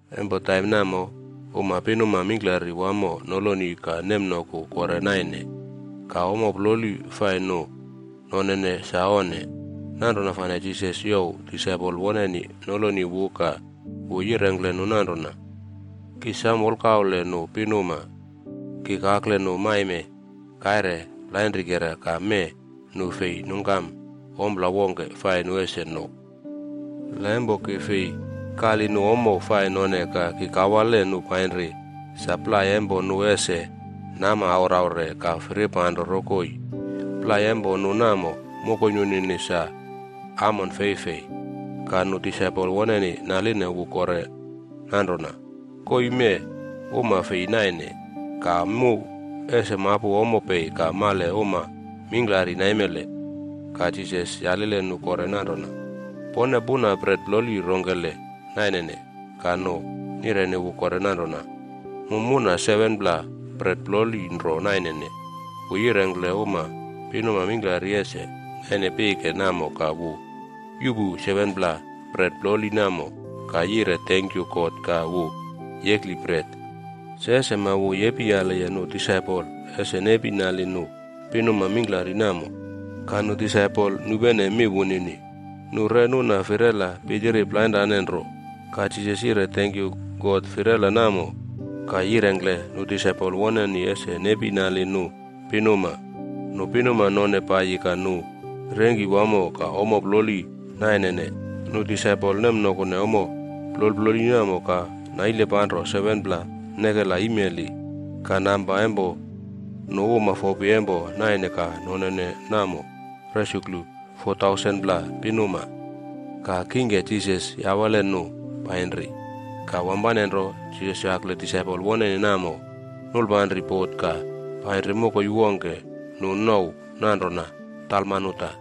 Empo taim namo, uma pinuma mingklari wamo noloni ka nemnoku kore naine. Ka ommo ploli fai nu nonene sa onne. Nanrona fane Jisas youw disaipol woneni noloni wu ka wu yirengkle nu nanrona, “Ki sam wolkaule nu pinuma. Ki kakle nu maime kaire plainrikera ka mee nu fei nungkam ompla wongke fai nu ese no. La empo ki fei kali nu ommo fai none ka ki kawale nu painri sa plai empo nu ese nama auraure ka firipanro rokoi. Plai empo nu namo, mokoi nunini sa amon feifei.” Ka nu disaipol woneni naline wu kore nanrona, “Koii mee uma fei naine! Ka mu ese mapu ommo pei ka male uma mingklari naimele?” Ka Jisas yalile nu kore nanrona, “Pone puna bret ploli rongkele nainene?” Ka nu nireni wu kore nanrona, “Mu muna 7pla bret ploli nro nainene.” Wu yirengkle uma pinuma mingklari ese naine pike namo ka wu yuꞌpu 7pla bret ploli namo ka yire tenkyu God ka wu yekli bret. Se sema, wu yepiyaliye nu disaipol ese nepi nali nu pinuma mingklari namo. Ka nu disaipol nupene mi wunini. Nu re nuna firela pitiri plainrane nro. Ka Jisas yire tenkyu God firela namo, ka yirengkle nu disaipol woneni ese nepi nali nu pinuma. Nu pinuma none paiyi ka nu rengki wamo ka ommo ploli nanaine. Nu disaipol nemnokune ommo plol ploli namo ka naile panro 7pla nekela imeli. Ka namba empo nu uma fopi empo naine ka nonene namo resuklu 4,000pla pinuma. Ka kingke, Jisas yawale nu painri. Ka wampane nro, Jisas yakle disaipol woneni namo, nulpanri bot ka painri mokoi wongke nu nouw nanrona Dalmanuta.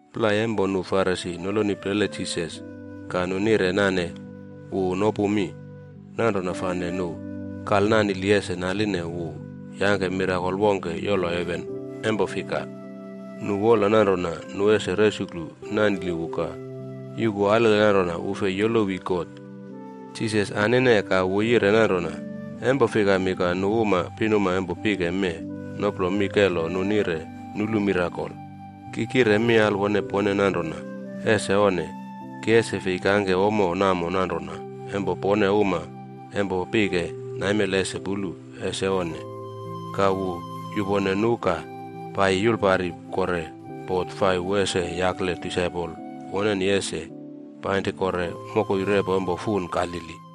Plai empo nu Farisi noloni plele Jisas ka nu nire nane wu nopu mi. Nanrona fane nu kalnanili ese naline wu yangke mirakol wongke yolo heven empo fika nu wola nanrona nu ese resuklu nanili wu ka yuku alele nanrona wu fei yolowi God. Jisas anine ka wu yire nanrona, “Empo fikami ka nu uma pinuma empo pike mee noplo mi kelo nu nire nulu mirakol? Ki kire mi alwone pone nanrona, ese onne. Ki ese fei kangke ommo namo nanrona empo pone uma empo pike naimele ese pulu. Ese onne!” Ka wu yupone nu ka paiyi yulpari kore bot fai wu ese yakle disaipol woneni ese painri kore mokoi repo empo fun Galili.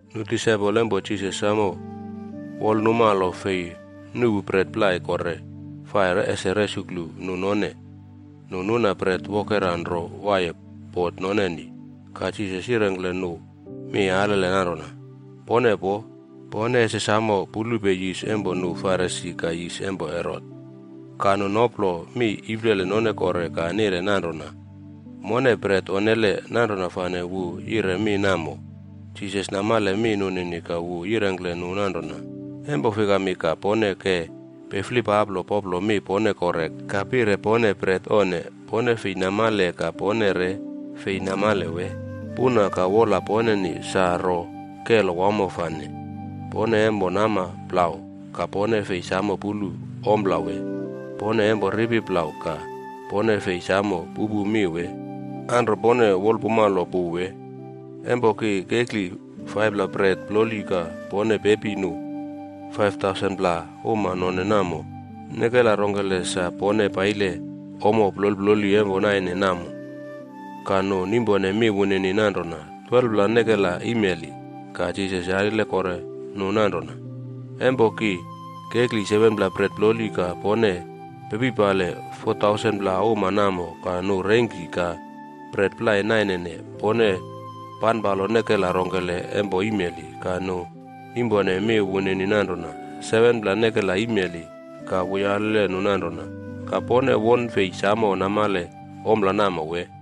Nu disaipol empo Jisas samo wolnumalo fei nuꞌpu bret plai kore fai ese resuklu nu none. Nu nuna bret wokera nro waiye bot noneni. Ka Jisas yirengkle nu mi alele nanrona, “Pone poo. Pone ese samo pulupe yis empo nu Farisi ka yis empo Herot.” Ka nu noplo mi iplele none kore ka nire nanrona, “Mone bret onnele, nanrona fane wu yire mi namo.” Jisas namale mi nunini ka wu yirengkle nu nanrona, “Empo fikami ka pone ke piflipaplo poplo mi pone kore ka pire pone bret onne? Pone fei namale ka pone re fei namale wee? Puna ka wola poneni sa ro kelo wamo fane? Pone empo nama plau, ka pone fei samo pulu ompla wee? Pone empo ripi plau ka pone fei samo pupu mi wee? Anro pone wolpumalo pu wee? Empo ki kekli 5pla bret ploli ka pone pepi nu 5,000pla uma none namo, nekela rongkele sa pone paile ommo plol ploli empo naine namo?” Ka nu nimpone mi wunini nanrona, “12pla nekela imeli.” Ka Jisas yalile kore nu nanrona, “Empo ki kekli 7pla bret ploli ka pone pepipali 4,000pla uma namo ka nu rengki ka bret plai nanaine, pone panpalo nekela rongkele empo imeli?” Ka nu nimpone mi wunini nanrona, “7pla nekela imeli.” Ka wu yalile nu nanrona, “Ka pone wone fei samo namale ompla namo wee?”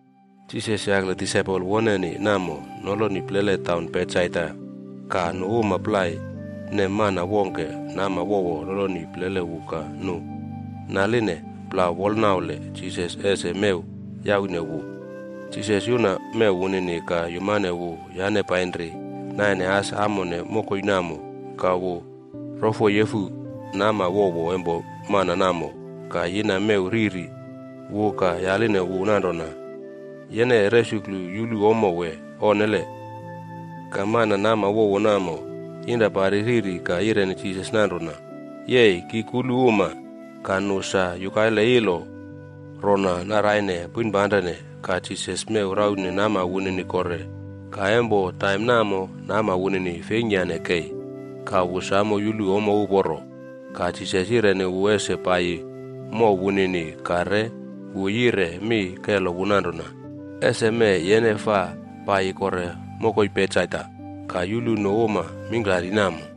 Jisas yakle disaipol woneni namo noloni plele taun Betsaida ka nu uma plai nem mana wongke nama wowo noloni plele wu ka nu naline plau wolnaule Jisas ese mew yaune wu. Jisas yuna mew wunini ka yumane wu yane painri naine as amone mokoi namo, ka wu rofoyefu nama wowo empo mana namo ka yina mew riri wu ka yaline wu nanrona, “Yene resuklu yulu ommo wee onnele?” Ka mana nama wowo namo yinra pari riri ka yireni Jisas nanrona, “Yei, ki kulu uma. Ka nu sa yukaile ilo rona naraine poinpanrene.” Ka Jisas mew raune nama wunini kore. Ka empo taim namo nama wunini feingkyane kei ka wu samo yulu ommo uporo. Ka Jisas yireni wu ese paiyi mow wunini ka re wu yire mi kelo wu nanrona, “Ese mee, yene faa paiyi kore mokoi Betsaida ka yulu nu uma mingklari namo.”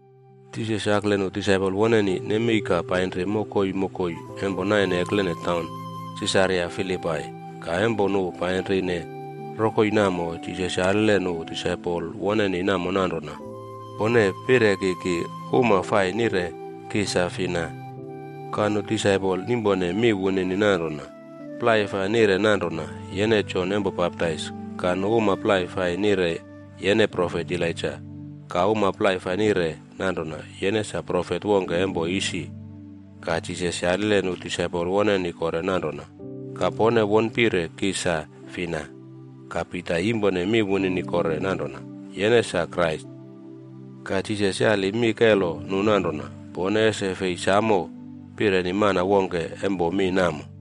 Jisas yakle nu disaipol woneni nemei ka painri mokoi mokoi empo naine eklene taun Sisaria Filipai. Ka empo nu painrine rokoi namo, Jisas yalile nu disaipol woneni namo nanrona, “Pone pire ki, nu uma fai nire ki sa fina?” Ka nu disaipol nimpone mi wunini nanrona, “Plai fai nire nanrona yene Jon Empo Baptais. Ka nu uma plai fai nire yene profet Elaija. Ka uma plai fai nire nanrona yene sa profet wongke empo isi.” Ka Jisas yalile nu disaipol woneni kore nanrona, “Ka pone won pire ki sa fina?” Ka Pita yimpone mi wunini kore nanrona, “Yene sa Krais.” Ka Jisas yali mi kelo nu nanrona, “Pone ese fei samo pireni mana wongke empo mi namo.”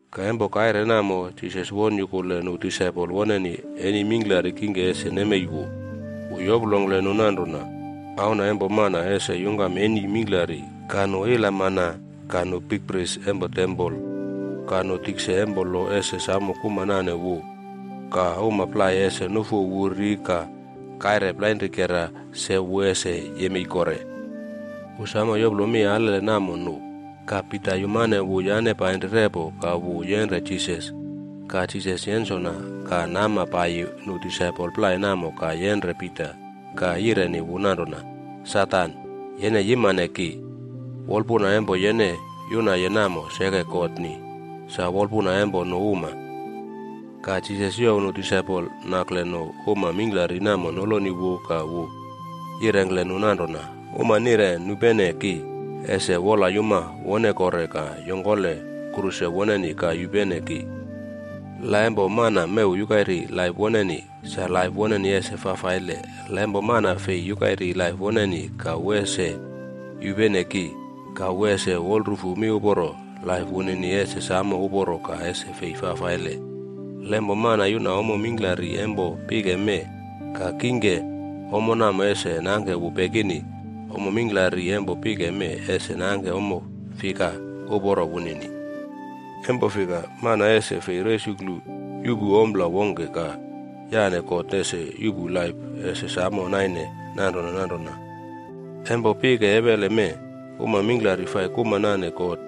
Ka empo kaire namo, Jisas won yukule nu disaipol woneni eni mingklari kingke ese nemei wu. Wu yoplongkle nu nanrona, “Auna empo Mana ese yungkam eni mingklari ka nu ilamana, ka nu bikpris empo tempol, ka nu tikse empo lo ese samo kuma nane wu. Ka uma plai ese nufu wu ri ka kaire plainrikera se, wu ese yemei kore.” Wu samo yoplo mi alele namo nu. Ka Pita yumane wu yane painri repo ka wu yenre Jisas. Ka Jisas yensona ka nama paiyi nu disaipol plai namo ka yenre Pita ka yireni wu nanrona, “Satan, yene yimane ki! Wolpuna empo yene yunaye namo seke God ni, sa wolpuna empo nu uma.” Ka Jisas youw nu disaipol nakle nu uma mingklari namo noloni wu ka wu yirengkle nu nanrona, “Uma nire nupene ki, ese wolyuma wone kore ka yongkole kruse woneni ka yupene ki. La empo mana mew yukairi laip woneni, sa laip woneni ese fafaile. La empo mana fei yukairi laip woneni ka wu ese yupene ki ka wu ese wolrufu miuporo, laip wunini ese samo uporo ka ese fei fafaile. La empo mana yuna ommo mingklari empo pike mee, ka kingke ommo namo ese nangke wu pekini, ommo mingklari empo pike mee ese nangke ommo fika uporo wunini? Empo fika, mana ese fei resuklu yuꞌpu ompla wongke ka yane God ese yuꞌpu laip ese samo naine nanrona nanrona. Empo pike ewele mee, uma mingklari fai kuma nane God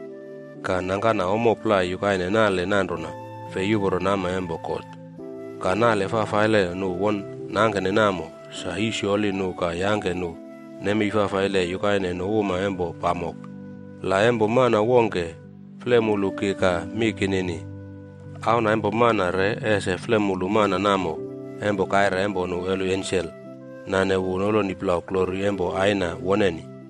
ka nangkana ommo plai yukaine nale nanrona fei uporo nama empo God, ka nale fafaile nu won nangkene namo sa yisyoli nu ka yangke nu nemei fafaile yukaine nu uma empo pamok. La empo mana wongke flemulu ki ka mi kinini, Auna empo Mana re ese flemulu mana namo empo kaire empo nu holi ensel nane wu noloni plau glori empo Aina woneni.”